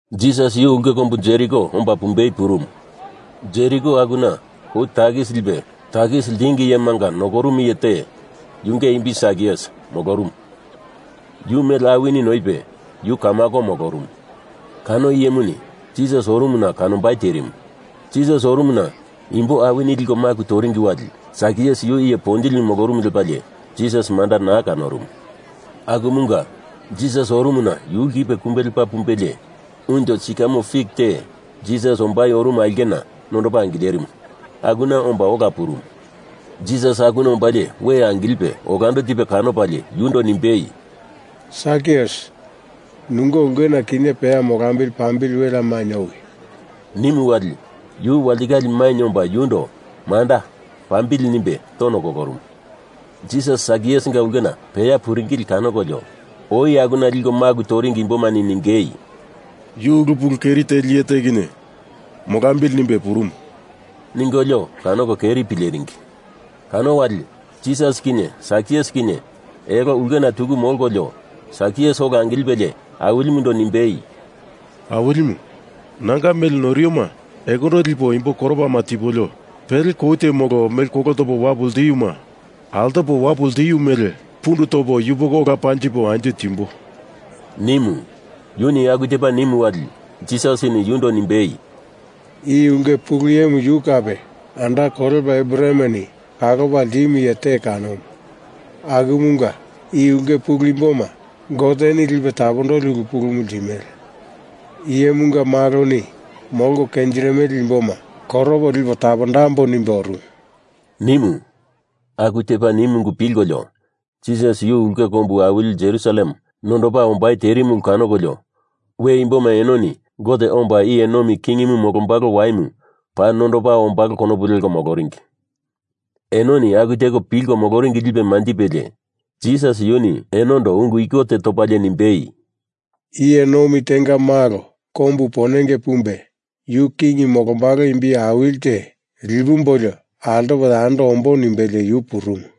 Jisas yu ulke kombu Jeriko omba pumbei purumu. Jeriko akuna kou takis lipe takis ltingi iyema nokorumu iye te, yunge imbi Sakius, molorumu. Yu mele awini noipe yu kamako molorumu. Kano iyemuni Jisas orumuna kanombai terimu. Jisas orumuna imbo awini liko maku toringi wali Sakius iye ponjili molorumu lepalie Jisas manda naa kanorumu. Akumunga Jisas orumuna yu lkipe kumbe lepa pumbelie unjo sikamo fik te Jisas ombai orumu aulkena nondopa angilerimu akuna omba ola purumu. Jisas akuna ombalie we angilipe olando tipe kanopalie yundo nimbei, “Sakius, nunge ulkena kinye peya molambili pambili welea mainye owi,” nimu wali yu walitikale mainye omba yundo “manda, pambili,” nimbe tono kolorumu. Jisas Sakiusinga ulkena peya puringili kanokolio oi akuna liko maku toringi imbomani ningei, “Yu ulu pulu keri teli iye te kinye molambili nimbe purumu,” ningolio kanoko keri pileringi. Kano wali, Jisas kinye Sakius kinye elo ulkena tuku molkolio Sakius ola angilipe Awilimundo nimbei, “Awilimu, nanga mele noiroma ekondo lipo imbo koropama tipolio, pele kou te molo mele kolo topo wapu ltiuma altopo wapu ltiu mele pundu topo yupoko ola panjipo anjo timbo,” nimu. Yuni aku tepa nimu wali Jisasini yundo nimbei, “I ulke pulu iyemu yu kape anda kolepa Abrahameni kalopa ltimu iye te kanomu, akumunga i ulke pulu imboma Goteni lipe tapondoli ulu pulumu ltimele. Iyemunga Maloni molko kenjirimele imboma koropo lipo tapondambo nimbe orumu,” nimu. Aku tepa nimu ungu pilkolio Jisas yu ulke kombu awili Jerusalem nondopa ombai terimu ulu kanokolio we imboma enoni Gote omba iye nomi kingimu molombalo waimu paa nondopa ombalo konopu leko moloringi. Enoni aku teko pilko moloringi lipe manjipelie Jisas yuni enondo ungu iko te topalie nimbei, “Iye nomi tenga malo kombu ponenge pumbe yu king molombalo imbi awili te, lipumbolio altopo yando ombo nimbelie yu purumu.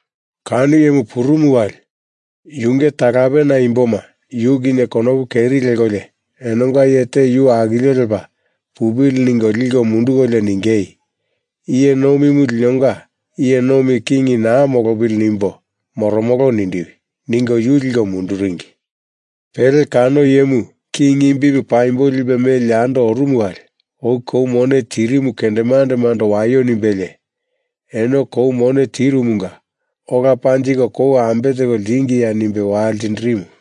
Kano iyemu purumu wali yunge talapena imboma yu kinye konopu keri lekolio enonga iye te yu akilio lepa pupili ningo liko mundukolio ningei, ‘I iye nomimu linonga iye nomi king naa molopili nimbo moromolo nindiwi,’ ningo yu liko munduringi. Pele kano iyemu king imbimu paimbo lipe meli yando orumu wali oi kou mone tirimu kendemandemando waio nimbelie, ‘Eno kou mone tirumunga ola panjiko kou ambe teko ltingiya?’ nimbe waltindirimu.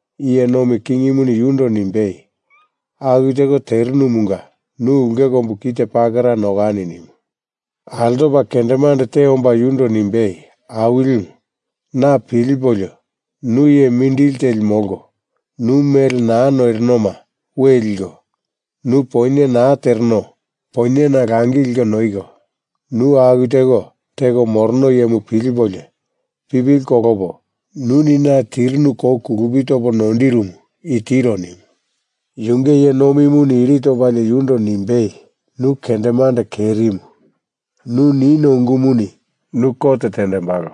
iye nomi kingimuni yundo nimbei, ‘Aku teko terinumunga nu ulke kombu kite pakera nokani,’ nimu. Altopa kendemande te omba yundo nimbei, ‘Awilimu, na pilipolio nu iye mindili teli molko, nu mele naa noirinoma we liko, nu poinye naa tereno poinyena langi liko noiko, nu aku teko teko morono iyemu pilipolio pipili kolopo nuni na tirinu kou kulupi topo noindirumu i tiro,’ nimu. Yunge iye nomimuni iri topalie yundo nimbei, ‘Nu kendemande kerimu. Nu nino ungumuni nu kot tendembalo.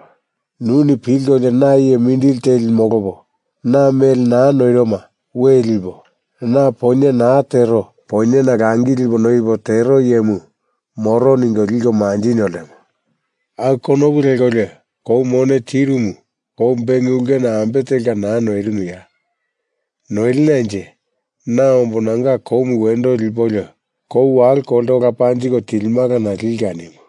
Nuni pilkolio na iye mindili teli molopo, na mele naa noiroma we lipo, na poinye naa tero poinyena langi lipo noipo tero iyemu moro ningo liko manjinio ltemo. Aku konopu lekolio kou mone tirumu kou beng ulkena ambe telka naa noirinuya? Noilinanje na ombo nanga koumu wendo lipolio kou walo kolte ola panjiko tilimalana lika,’ nimu.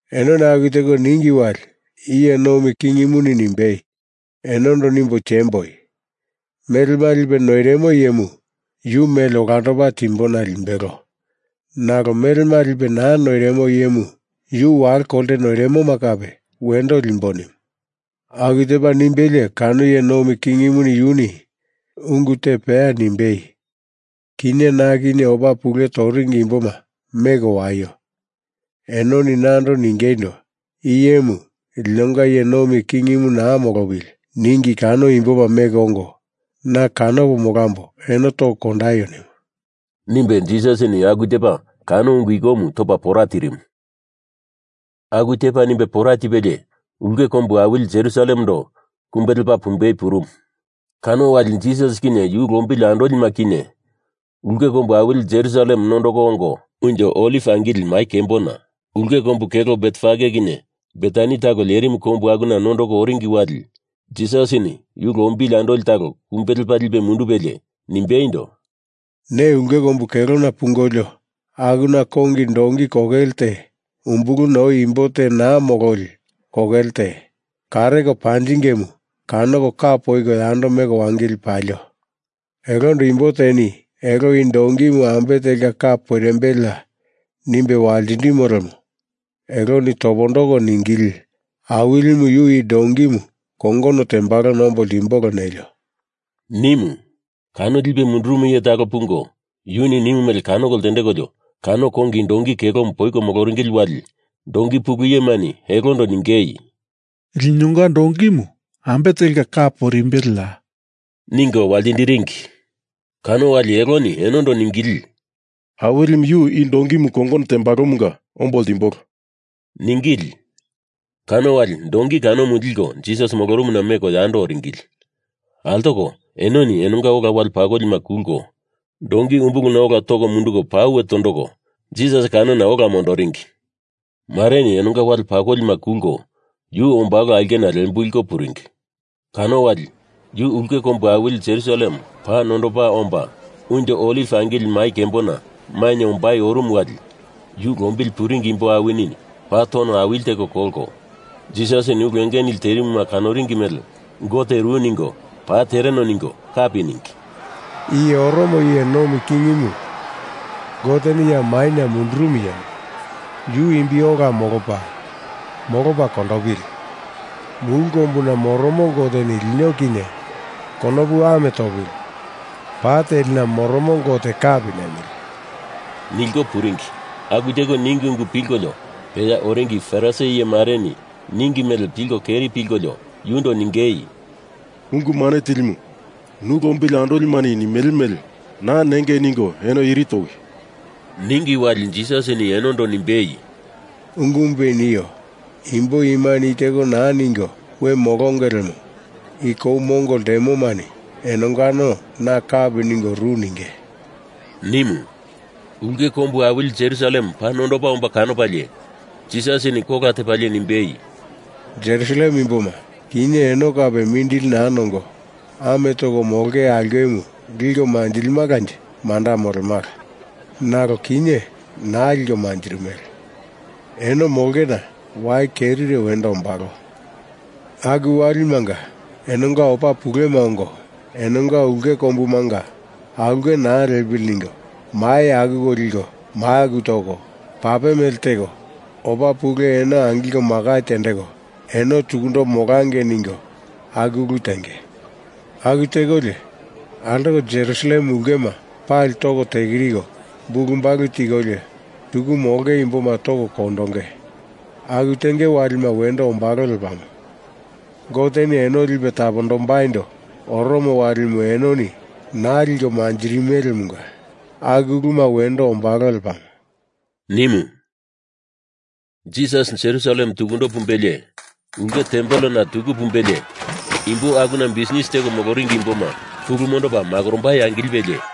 Enoni aku teko ningi wali iye nomi kingimuni nimbei, ‘Enondo nimbo tiemboi. Melema lipe noirimo iyemu yu mele olandopa timbona limbelo. Nalo melema lipe naa noirimo iyemu yu walo kolte noirimoma kape wendo limbo,’ nimu. Aku tepa nimbelie kano iye nomi kingimu yuni ungu te peya nimbei, ‘Kinye na kinye opa pule toringi imboma meko waio! Enoni nando ningeindo, i iyemu linonga iye nomi kingimu naa molopili ningi kano imboma meko ongo na kanopo molambo eno toko kondaio’ nimu,” nimbe Jisasini aku tepa kano ungu ikomu topa pora tirimu. Aku tepu nimbe pora tipelie Ulke Kombu Awili Jerusalemando kumbe lepa pumbei purumu. Kano wali Jisas kinye yu lombili andolima kinye ulke kombu awili Jerusalem nondoko ongo Unjo Oliv Angili Mai Kembona, ulke kombu kelo Betfage kinye Betani talo lerimu kombu akuna nondoko oringi wali Jisasini yu lombili andoli talo kumbe lepa lipe mundupelie, nimbeindo, “Ne ulke kombu kelona pungolio akuna kongi donki kokele te, umbuluna oi imbo te naa mololi kokele te, kareko panjingemu kanoko ka poiko yando meko wangili palio! Elondo imbo teni elo i donkimu ambe telka ka poirimbeleya nimbe waltindimo lemo eloni topondoko ningili, Awilimu yu i donkimu kongono tembalona ombo ltimbolo nelio,” nimu. Kano lipe mundurumu iye talo pungo yuni nimu mele kanoko ltendekolio kano kongi donki kokelemu poiko moloringili wali donki pulu iyemani elondo ningei, “Linonga donkimu ambe telka ka poirimbeleya?” ningo waltindiringi. Kano wali eloni enondo ningili, “Awilimu yu i donkimu kongono tembalomunga ombo ltimbolo,” ningili. Kano wali donki kanomu liko Jisas molorumuna meko yando oringili. Altoko enoni enonga ola wale pakolima kulko, donki umbuluna ola toko munduko pauwe tondoko Jisas kanona ola mondoringi. Mareni enonga wale pakolima kulko yu ombalo aulkena lembulko puringi. Kano wali yu ulke kombu awili Jerusalem paa nondopa omba Unjo Oliv Angili Mai Kembona mainye ombai orumu wali yu lombili puringi imbo awini paa tono awili tiko kolko Jisasini ulu enge nili terimuna kanoringi mele Gote ru ningo paa tereno ningo kapi ningei, “I oromo iye nomi kingimu, Goteni ya maina mundurumu iyemu, yu imbi ola molopa, molopa kondopili! Mulu kombuna moromo Goteni lino kinye konopu ame topili! Pa telina moromo Gote kapi nemili,” nilko puringi. Aku teko ningi ungu pilkolio peya oringi Farisi iye mareni ningi mele pilko keri pilkolio yundo ningei, “Ungu Mane Tilimu, nu lombili andolimani nimele mele. Naa nengei ningo eno iri towi,” ningi wali Jisasini enondo nimbei, “Ungumupe i nio. Imbo imani i teko naa ningo we molonge lemo i kou mongo ltemomani enongano na kapi ningo ru ninge,” nimu. Ulke kombu awili Jerusalem paa nondopa omba kanopalie, Jisasini kola tepalie nimbei, “Jerusalem imboma, kinye eno kape mindili naa nongo ame toko molonge aulkemu liko manjilimalanje manda molemala. Nalo kinye naa liko manjirimele. Eno molongena wai kerire wendo ombalo. Aku walimanga enonga opa pulema ongo enonga ulke kombumunga aulke naa lepili ningo mai akuko liko maku toko, pape mele teko opa pule eno angilko makai tendeko eno tukundo molangei ningo aku ulu tenge. Aku tekolio, altoko Jerusalem ulkema pali toko tekiriko bulubalu tikolio tuku molonge imboma toko kondonge. Aku tenge walima wendo ombalo lepamo. Goteni eno lipe tapondombaindo oromo walimu enoni naa liko manjirimelemunga aku uluma wendo ombalo lepamo,” nimu. Jisas Jerusalem tukundo pumbelie, ulke tempelena tuku pumbelie imbo akuna bisnis teko moloringi imboma pulu mondopa makorombai angilipelie,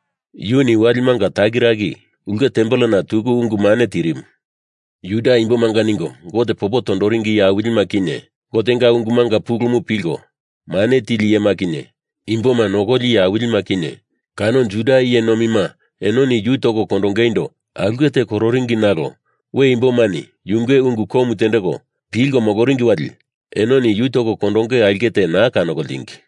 Yuni walimanga takiraki ulke tempelena tuku ungu mane tirimu. Juda imbomanga ningo Gote popo tondoringi iye awilima kinye, Gotenga ungumanga pulumu pilko mane tili iyema kinye, imboma nokoli iye awilima kinye, kano Juda iye nomima enoni yu toko kondongeindo aulke te kororingi nalo we imbomani yunge ungu komu tendeko pilko moloringi wali enoni yu toko kondonge aulke te naa kanoko ltingi.